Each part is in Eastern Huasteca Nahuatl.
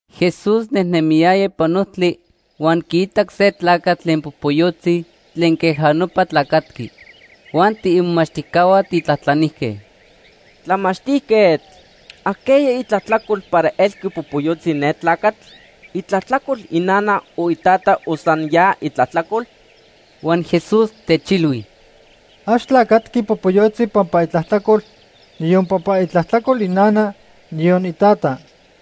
Jesús nejnemiyaya ipan ojtli, huan quiitac se tlacatl tlen popoyotzi tlen queja nopa tlacatqui. Huan tiimomachtijcahua tijtlajtlanijque: ―Tlamachtijquetl, ¿ajqueya itlajtlacol para elqui popoyotzi ne tlacatl? ¿Itlajtlacol inana o itata o san ya itlajtlacol? Huan Jesús techilhui: ―Ax tlacatqui popoyotzi pampa itlajtlacol, niyon pampa itlajtlacol inana, niyon itata.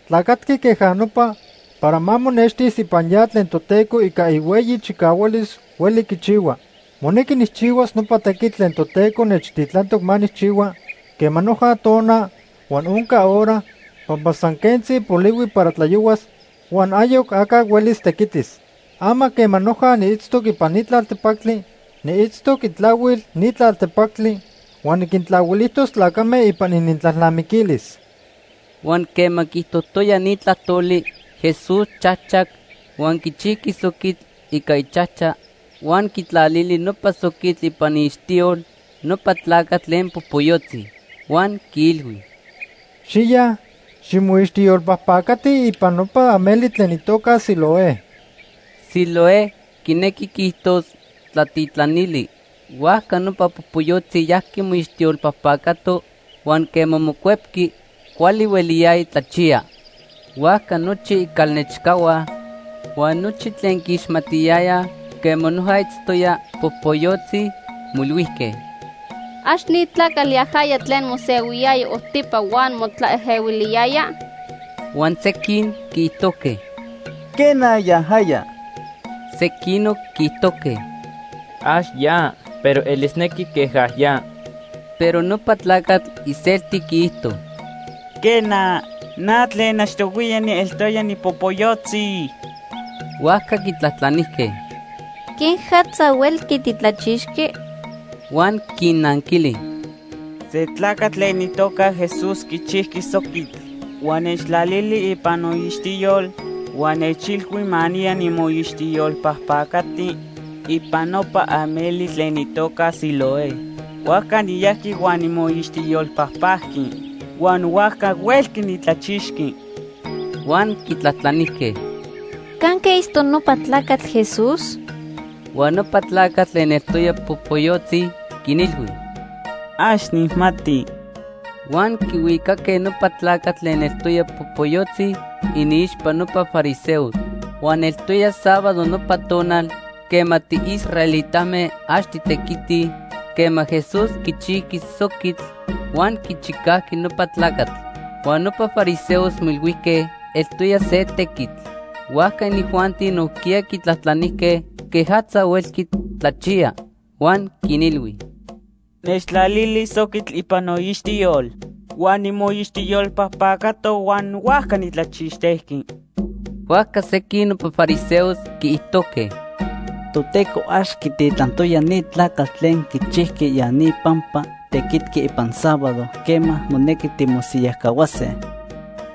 Tlacatqui queja nopa para ma monextis ipan ya tlen Toteco ica ihueyi chicahualis hueli quichihua. Monequi nijchihuas nopa tequitl tlen Toteco nechtitlantoc ma nijchihua quema noja tona huan onca hora, pampa san quentzi polihui para tlayohuas huan ayoc aca huelis tequitis. Ama quema noja niitztoc ipan ni tlaltepactli, niitztoc itlahuil ni tlaltepactli huan niquintlahuilijtos tlacame ipan inintlalnamiquilis. Huan quema quiijtojtoya ni tlajtoli, Jesús chajchac huan quichijqui soquitl ica ichajcha huan quitlalili nopa soquitl ipan iixtiyol nopa tlacatl tlen popoyotzi. Huan quiilhui: ―Xiya, ximoixtiyolpajpacati ipan nopa ameli tlen itoca Siloé. (Siloé quinequi quiijtos: ‘Tlatitlanili’.) Huajca nopa popoyotzi yajqui moixtiyolpajpacato huan quema mocuepqui, cuali hueliyaya tlachiya. Huajca nochi icalnechcahua huan nochi tlen quiixmatiyayaj quema noja itztoya popoyotzi moilhuijque: ―¿Ax ni tlacatl yajaya tlen mosehuiyaya ojtipa huan motlaejehuiliyaya? Huan sequin quiijtojque: ―Quena, yajaya. Sequinoc quiijtojque: ―Ax ya, pero elisnequi queja ya. Pero nopa tlacatl iselti quiijto: ―Quena, na tlen achtohuiya nieltoya nipopoyotzi. Huajca quitlajtlanijque: ―¿Quejatza huelqui titlachixqui? Huan quinnanquili: ―Se tlacatl tlen itoca Jesús quichijqui soquitl huan nechtlalili ipan noixtiyol huan nechilhui ma niya nimoixtiyolpajpacati ipan nopa ameli tlen itoca Siloé. Huajca niyajqui huan nimoixtiyolpajpajqui huan huajca huelqui nitlachixqui. Huan quitlajtlanijque: ―¿Canque itztoc nopa tlacatl Jesús? Huan nopa tlacatl tlen eltoya popoyotzi quinilhui: ―Ax nijmati. Huan quihuicaque nopa tlacatl tlen eltoya popoyotzi iniixpa nopa fariseos. Huan eltoya sábado nopa tonal quema tiisraelitame ax titequitij quema Jesús quichijqui soquitl huan quichicajqui nopa tlacatl. Huan nopa fariseos moilhuijque eltoya se tequitl. Huajca inijuanti nojquiya quitlajtlanijque quejatza huelqui tlachiya. Huan quinilhui: ―Nechtlalili soquitl ipan noixtiyol, huan nimoixtiyolpajpacato huan huajca nitlachixtejqui. Huajca sequin nopa fariseos quiijtojque: “Toteco ax quititlantoya ni tlacatl tlen quichijqui ya ni pampa tequitqui ipan sábado quema monequi timosiyajcahuase.”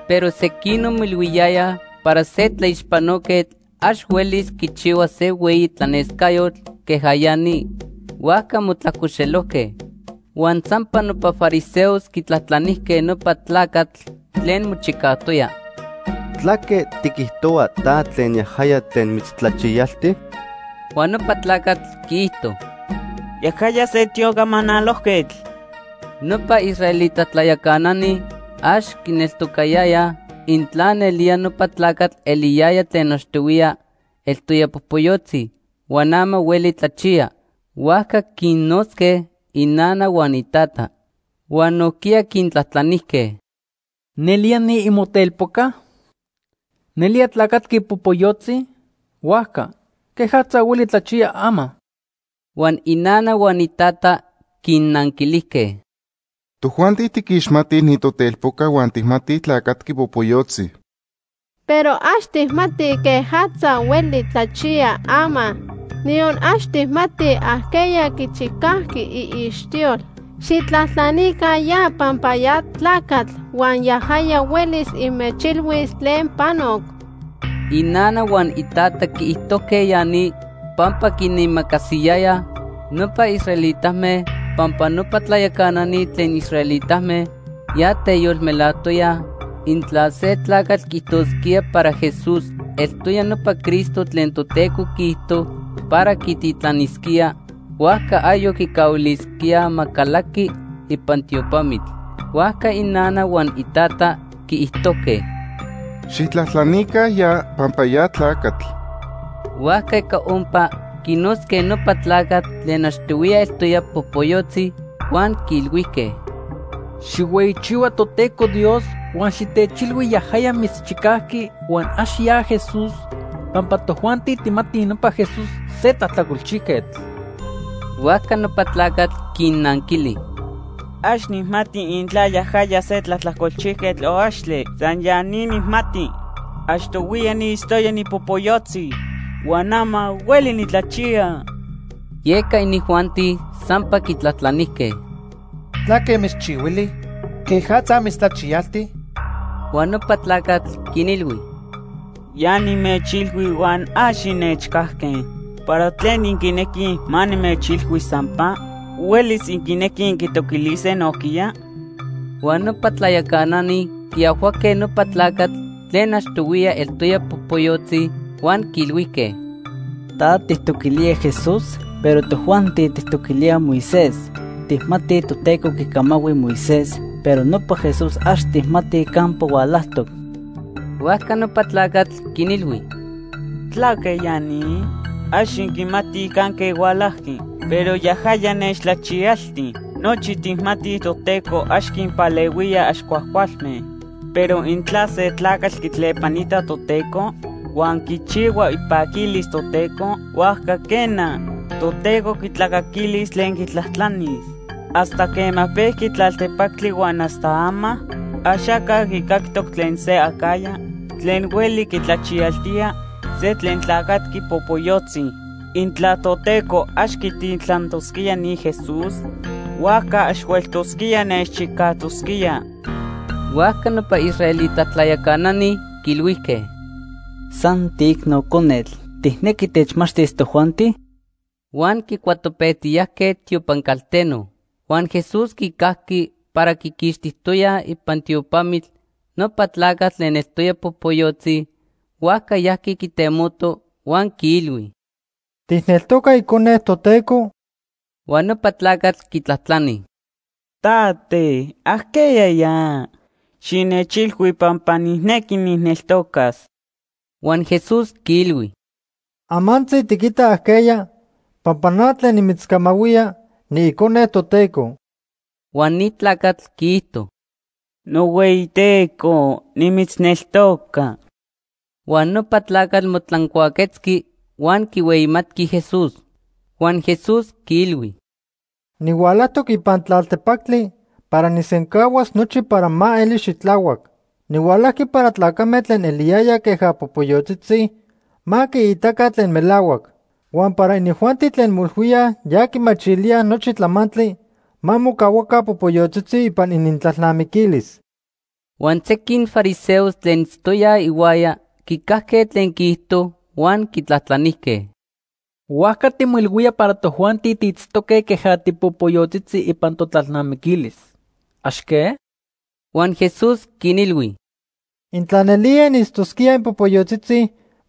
Pero sequinoc moilhuiyayaj para se tlaixpanoquetl ax huelis quichihuas se hueyi tlanescayotl queja ya ni. Huajca motlajcoxelojque. Huan sampa nopa fariseos quitlajtlanijque nopa tlacatl tlen mochicajtoya: ―¿Tlaque tiquijtohua ta tlen yajaya tlen mitztlachiyalti? Huan nopa tlacatl quiijto: ―Yajaya se tiocamanalojquetl. Nopa israelita tlayacanani ax quineltocayayaj intla nelía nopa tlacatl eliyaya tlen achtohuiya eltoya popoyotzi huan ama hueli tlachiya, huajca quinnotzque inana huan itata. Huan nojquiya quintlajtlanijque: ―¿Nelía, ni imotelpoca? ¿Nelía tlacatqui popoyotzi? Huajca ¿quejatza hueli tlachiya ama? Huan inana huan itata quinnanquilijque: ―Tojuanti tiquixmatij ni totelpoca huan tijmatij tlacatqui popoyotzi. Pero ax tijmatij quejatza hueli tlachiya ama, niyon ax tijmatij ajqueya quichicajqui iixtiyol. Xijtlajtlanica ya pampa ya tlacatl huan yajaya huelis inmechilhuis tlen panoc. Inana huan itata quiijtojque ya ni pampa quinimacasiyayaj nopa israelitame pampa nopa tlayacanani tlen israelitame ya teyolmelajtoyaj intla se tlacatl quiijtosquía para Jesús eltoya nopa Cristo tlen Toteco quiijto para quititlanisquía, huajca ayoc quicahuilisquíaj ma calaqui ipan tiopamitl. Huajca inana huan itata quiijtojque: ―Xijtlajtlanica ya pampa ya tlacatl. Huajca ica ompa quinotzque nopa tlacatl tlen achtohuiya eltoya popoyotzi huan quiilhuijque: ―Xijhueyichihua Toteco Dios, huan xitechilhui yajaya mitzchicajqui huan ax ya Jesús, pampa tojuanti tijmatij nopa Jesús se tlajtlacolchijquetl. Huajca nopa tlacatl quinnanquili: ―Ax nijmati intla yajaya se tlajtlacolchijquetl o axtle. San ya ni nijmati. Achtohuiya niitztoya nipopoyotzi huan ama hueli nitlachiya. Yeca inijuanti sampa quitlajtlanijque: ―¿Tlaque mitzchihuili? ¿Quejatza mitztlachiyalti? Huan nopa tlacatl quinilhui: ―Ya nimechilhui huan ax innechcajque. ¿Para tlen inquinequij ma nimechilhui sampa? ¿Huelis inquinequij inquitoquilise nojquiya? Huan nopa tlayacanani quiajhuaque nopa tlacatl tlen achtohuiya eltoya popoyotzi huan quiilhuijque: ―Ta tijtoquilía Jesús, pero tojuanti tijtoquilíaj Moisés. Tijmatij Toteco quicamahui Moisés, pero nopa Jesús ax tijmatij campa hualajtoc. Huajca nopa tlacatl quinilhui: ―¿Tlaque ya ni? Ax inquimatij canque hualajqui, pero yajaya nechtlachiyalti. Nochi tijmatij Toteco ax quinpalehuía ax cuajcualme, pero intla se tlacatl quitlepanita Toteco huan quichihua ipaquilis Toteco, huajca quena, Toteco quitlacaquilis tlen quitlajtlanis. Hasta quema pejqui tlaltepactli huan hasta ama, axaca quicactoc tlen se acajya tlen hueli quitlachiyaltía se tlen tlacatqui popoyotzi. Intla Toteco ax quititlantosquía ni Jesús, huajca ax hueltosquía nechchicajtosquía. Huajca nopa israelita tlayacanani quiilhuijque: ―¡San tiicno conetl! ¿Tijnequi techmachtis tojuanti? Huan quicuatopejtiyajque tiopan calteno. Huan Jesús quicajqui para quiquixtijtoyaj ipan tiopamitl nopa tlacatl tlen eltoya popoyotzi, huajca yajqui quitemoto huan quiilhui: ―¿Tijneltoca Icone Toteco? Huan nopa tlacatl quitlajtlani: ―Tate, ¿ajqueya ya? Xinechilhui pampa nijnequi nijneltocas. Huan Jesús quiilhui: ―Amantzi tiquita ajqueya pampa na tlen nimitzcamahuía, niIcone Toteco. Huan ni tlacatl quiijto: ―NohueyiTeco, nimitzneltoca. Huan nopa tlacatl motlancuaquetzqui huan quihueyimatqui Jesús. Huan Jesús quiilhui: ―Nihualajtoc ipan tlaltepactli para nijsencahuas nochi para ma eli xitlahuac. Nihualajqui para tlacame tlen eliyayaj queja popoyotzitzi ma quiitaca tlen melahuac. Huan para inijuanti tlen moilhuíaj ya quimachilíaj nochi tlamantli ma mocahuaca popoyotzitzi ipan inintlalnamiquilis. Huan sequin fariseos tlen itztoyaj ihuaya quicajque tlen quiijto huan quitlajtlanijque: ―Huajca timoilhuía para tojuanti tiitztoque queja tipopoyotzitzi ipan totlalnamiquilis. ¿Ax que? Huan Jesús quinilhui: ―Intla nelía initztosquíaj inpopoyotzitzi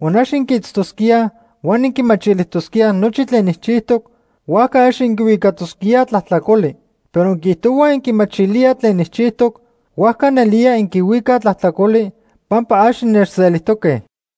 huan ax inquiitztosquíaj huan inquimachilijtosquíaj nochi tlen nijchijtoc, huajca ax inquihuicatosquíaj tlajtlacoli. Pero inquiijtohuaj inquimachilíaj tlen nijchijtoc, huajca nelía inquihuicaj tlajtlacoli pampa ax innechselijtoque.